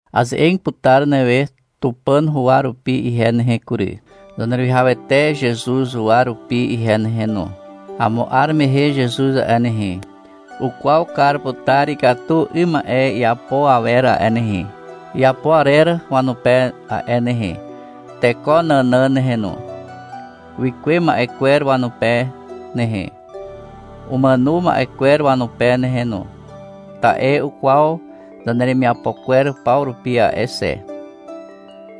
Aze'eg putar newe Tupàn huwa rupi ihe nehe kury, Zaneruwihawete Zezuz huwa rupi ihe nehe no. Amo 'ar mehe Zezuz a'e nehe, ukwaw kar putar ikatu 'ym ma'e iapo awer a'e nehe, iapo arer wanupe a'e nehe, teko nànàn nehe no, wikuwe ma'e kwer wanupe nehe, umàno ma'e kwer wanupe nehe no, ta'e ukwaw zaneremiapo kwer paw rupi a'e xe.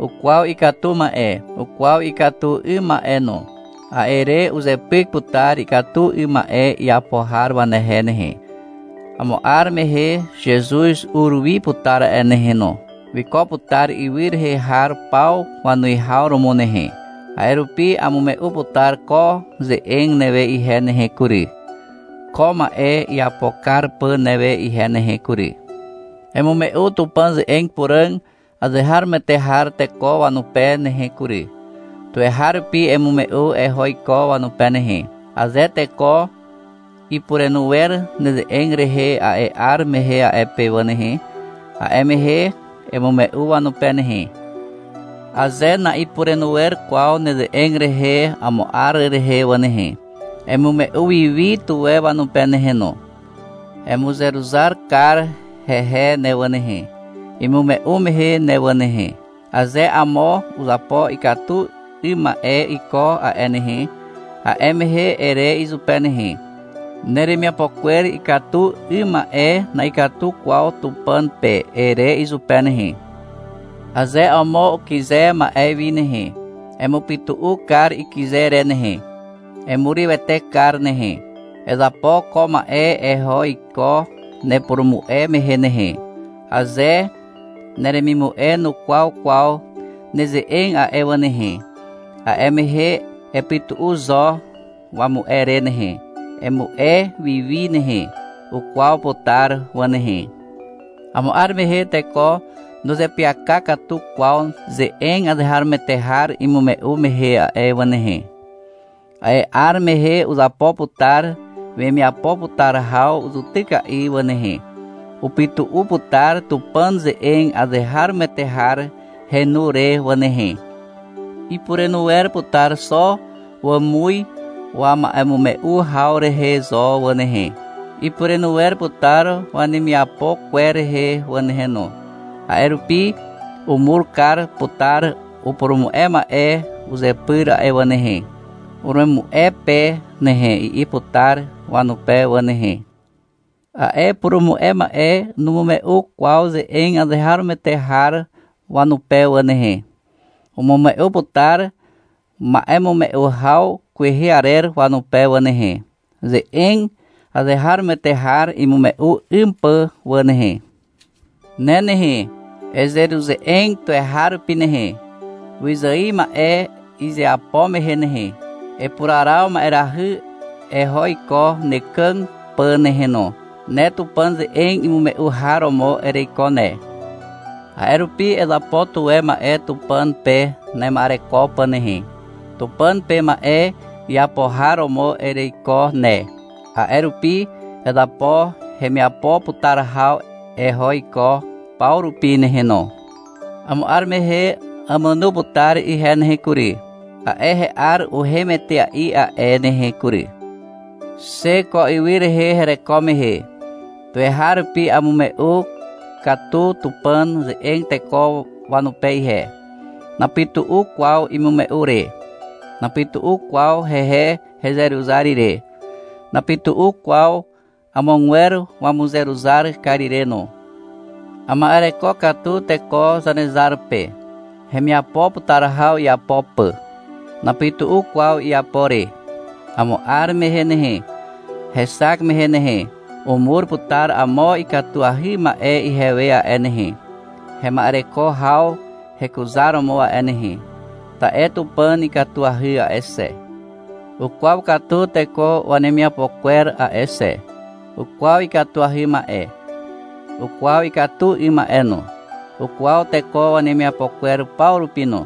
Ukwaw ikatu ma'e. Ukwaw ikatu 'ym ma'e no. A'e re uzepyk putar ikatu 'ym ma'e iapo har wanehe nehe. Amo 'ar mehe Zezuz ur wi putar a'e nehe no. Wiko putar ywy rehe har paw wanuwihaw romo nehe. A'e rupi amume'u putar ko ze'eg newe ihe nehe kury, ko ma'e iapo kar pà newe ihe nehe kury. Emume'u Tupàn ze'eg puràg azeharomoete har teko wanupe nehe kury. Tuweharupi emume'u eho iko wanupe nehe. Aze teko ipurenu wer neze'eg rehe a'e 'ar mehe a'e pe wà nehe, a'e mehe emume'u wanupe nehe. Aze na'ipurenu wer kwaw neze'eg rehe amo 'ar rehe wà nehe, emume'u wiwi tuwe wanupe nehe no. Emuzeruzar kar hehe ne wà nehe, imume'u mehe ne wà nehe. Aze amo uzapo ikatu 'ym ma'e iko a'e nehe, a'e mehe ere izupe nehe, — Neremiapo kwer ikatu 'ym ma'e na'ikatu kwaw Tupàn pe, ere izupe nehe. Aze amo ukyze ma'e wi nehe, emupytu'u kar ikyze re nehe, emurywete kar nehe. Ezapo ko ma'e eho iko nepurumu'e mehe nehe. Aze neremimu'e nukwaw kwaw neze'eg a'e wà nehe, a'e mehe epytu'u zo wamu'e re nehe, emu'e wiwi nehe. Ukwaw putar wà nehe. Amo 'ar mehe teko nuzeapyaka katu kwaw ze'eg azeharomoete har imume'u mehe a'e wà nehe. A'e 'ar mehe uzapo putar wemiapo putar haw zutyka'i wà nehe. Upytu'u putar Tupàn ze'eg azeharomoete har henu re wà nehe. Ipurenu wer putar xo wàmuz wama'emume'u haw rehe zo wà nehe. Ipurenu wer putar wanemiapo kwer rehe wà nehe no. A'e rupi umur kar putar upurumu'e ma'e uzepyr a'e wà nehe. — Uremu'e pe nehe, i'i putar wanupe wà nehe. A'e upurumu'e ma'e numume'u kwaw ze'eg azeharomoete har wanupe wà nehe. Umume'u putar ma'emume'u haw kwehe arer wanupe wà nehe, ze'eg azeharomoete har imume'u 'ym pà wà nehe. Ne nehe, ezeruze'eg tuweharupi nehe, wyzài ma'e izeapo mehe nehe. Epuraraw ma'erahy eho iko nekàg pà nehe no. Ne Tupàn ze'eg imume'u har romo ereiko ne. A'e rupi ezapo tuwe ma'e Tupàn pe nema'ereko pà nehe. Tupàn pe ma'e iapo har romo ereiko ne. A'e rupi ezapo hemiapo putar haw eho iko paw rupi nehe no. Amo 'ar mehe àmàno putar ihe nehe kury. A'e he'ar uhem etea'i a'e nehe kury. Xe ko ywy rehe hereko mehe, tuweharupi amume'u katu Tupàn ze'eg teko wanupe ihe. Napytu'u kwaw imume'u re. Napytu'u kwaw hehe hezeruzar ire. Napytu'u kwaw amogwer wamuzeruzar kar ire no. Ama'ereko katu teko Zanezar pe, hemiapo putar haw iapo pà. Napytu'u kwaw iapo re. Amo 'ar mehe nehe, hexak mehe nehe, umur putar amo ikatuahy ma'e ihewe a'e nehe, hema'ereko haw hekuzaromo a'e nehe. Ta'e Tupàn ikatuahy a'e xe. Ukwaw katu teko wanemiapo kwer a'e xe. Ukwaw ikatuahy ma'e. Ukwaw ikatu 'ym ma'e no. Ukwaw teko wanemiapo kwer paw rupi no.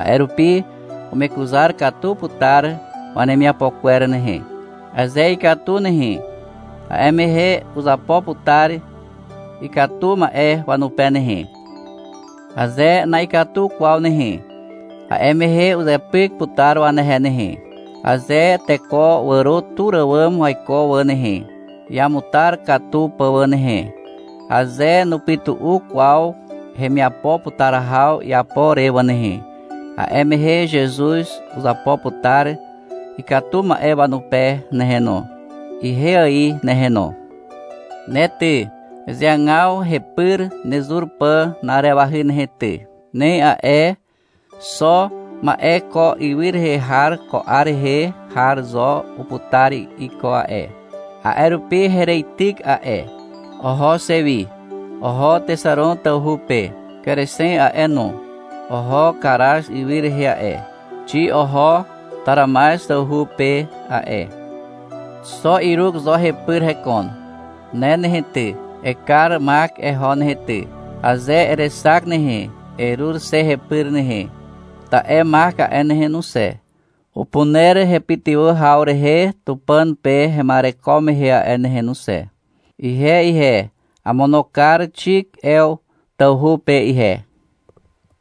A'e rupi umekuzar katu putar wanemiapo kwer nehe. Aze ikatu nehe, a'e mehe uzapo putar ikatu ma'e wanupe nehe. Aze na'ikatu kwaw nehe, a'e mehe uzepyk putar wanehe nehe. Aze teko wàro tur àwàm waiko wà nehe, iamutar katu pà wà nehe, aze nupytu'u kwaw hemiapo putar haw iapo re wà nehe, a'e mehe Zezuz uzapo putar ikatu ma'e wanupe nehe no, ihe ài nehe no. Ne ty, ezeagaw hepyr nezur pà na'arewahy nehe ty. Nem a'e, xo ma'e ko ywy rehe har ko 'ar rehe har zo uputar iko a'e. A'e rupi hereityk a'e. Oho xe wi. Oho Texaron tawhu pe. Kerexen a'e no, oho Karaz ywy rehe a'e. Xi oho Taramaz tawhu pe a'e. Xo Iruk zo hepyr hekon. Ne nehe ty, ekar Mak eho nehe ty. Aze erexak nehe, erur xe hepyr nehe. Ta'e Mak a'e nehe no xe, upuner hepytywà haw rehe Tupàn pe hema'ereko mehe a'e nehe no xe. Ihe ihe, amono kar Xik Ew tawhu pe ihe.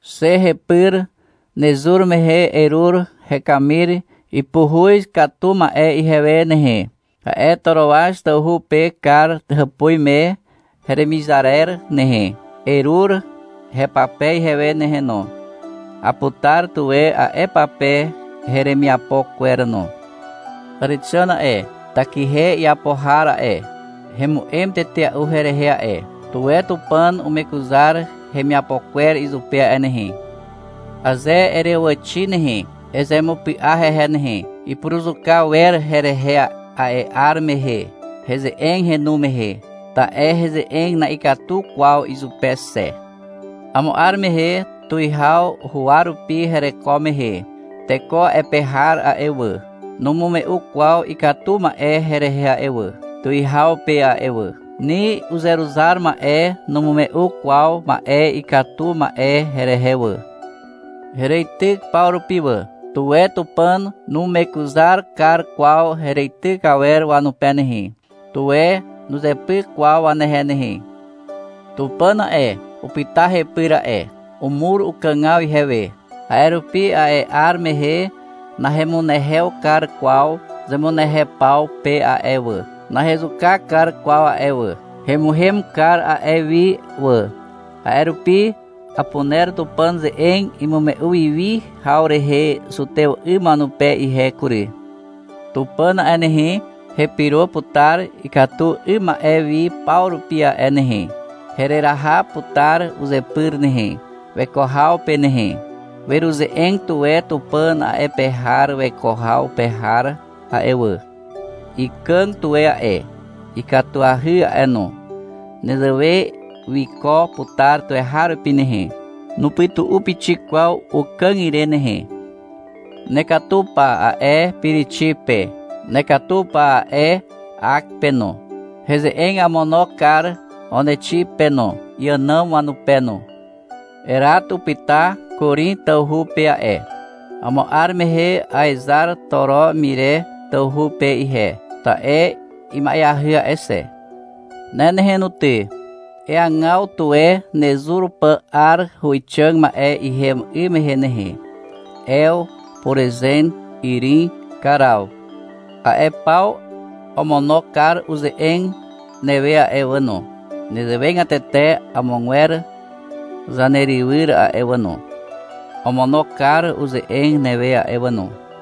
Xe hepyr nezur mehe erur hekamir ipuhuz katu ma'e ihewe nehe, a'e Toroaz tawhu pe Kar hàpuz me heremizarer nehe. Erur hepape ihewe nehe no. Aputar tuwe a'e pape heremiapo kwer no. Àrexàn a'e, takihe iapo har a'e, hemu'em tetea'u herehe a'e. Tuwe Tupàn umekuzar hemiapo kwer izupe a'e nehe. Aze ereàwàxi nehe, ezemupy'a hehe nehe. Ipuruzuka wer herehe a'e 'ar mehe, heze'eg henu mehe. Ta'e heze'eg na'ikatu kwaw izupe xe. Amo 'ar mehe tuwihaw huwa rupi hereko mehe, teko a'e pe har a'e wà, numume'u kwaw ikatu ma'e herehe a'e wà, tuwihaw pe a'e wà. Ni uzeruzar ma'e numume'u kwaw ma'e ikatu ma'e herehe wà. Hereityk paw rupi wà. Tuwe Tupàn numekuzar kar kwaw hereityk awer wanupe nehe. Tuwe nuzepyk kwaw wanehe nehe. Tupàn a'e, upyta hepyr a'e. Umur ukàgaw ihewe. A'e rupi a'e 'ar mehe nahemunehew kar kwaw zemunehew paw pe a'e wà, nahezuka kar kwaw a'e wà. Hemuhem kar a'e wi wà. A'e rupi apuner Tupàn ze'eg imume'u wiwi haw rehe zutew 'ym wanupe ihe kury. Tupàn a'e nehe, hepyro putar ikatu 'ym ma'e wi paw rupi a'e nehe. Hereraha putar uzepyr nehe, weko haw pe nehe. Weruze'eg tuwe Tupàn a'e pe har weko haw pe har a'e wà. Ikàg tuwe a'e, ikatuahy a'e no. Nezewe wiko putar tuweharupi nehe. Nupytu'u pixik kwaw ukàg ire nehe. — Nekatu pa, a'e Pirixi pe. — Nekatu pa, a'e Ak pe no. Heze'eg amono kar Onexi pe no, iànàm wanupe no. Erat upyta Korin tawhu pe a'e. Amo 'ar mehe aezar Toro Mire tawhu pe ihe, ta'e ima'eahy a'e xe. Ne nehe no ty, eagaw tuwe nezur pà 'ar huwixàg ma'e ihem 'ym mehe nehe. Ew, Puruzen, Irin, Karaw. A'e paw omono kar uze'eg newe a'e wà no. Nezewegatete amogwer zanerywyr a'e wà no, omono kar uze'eg newe a'e wà no.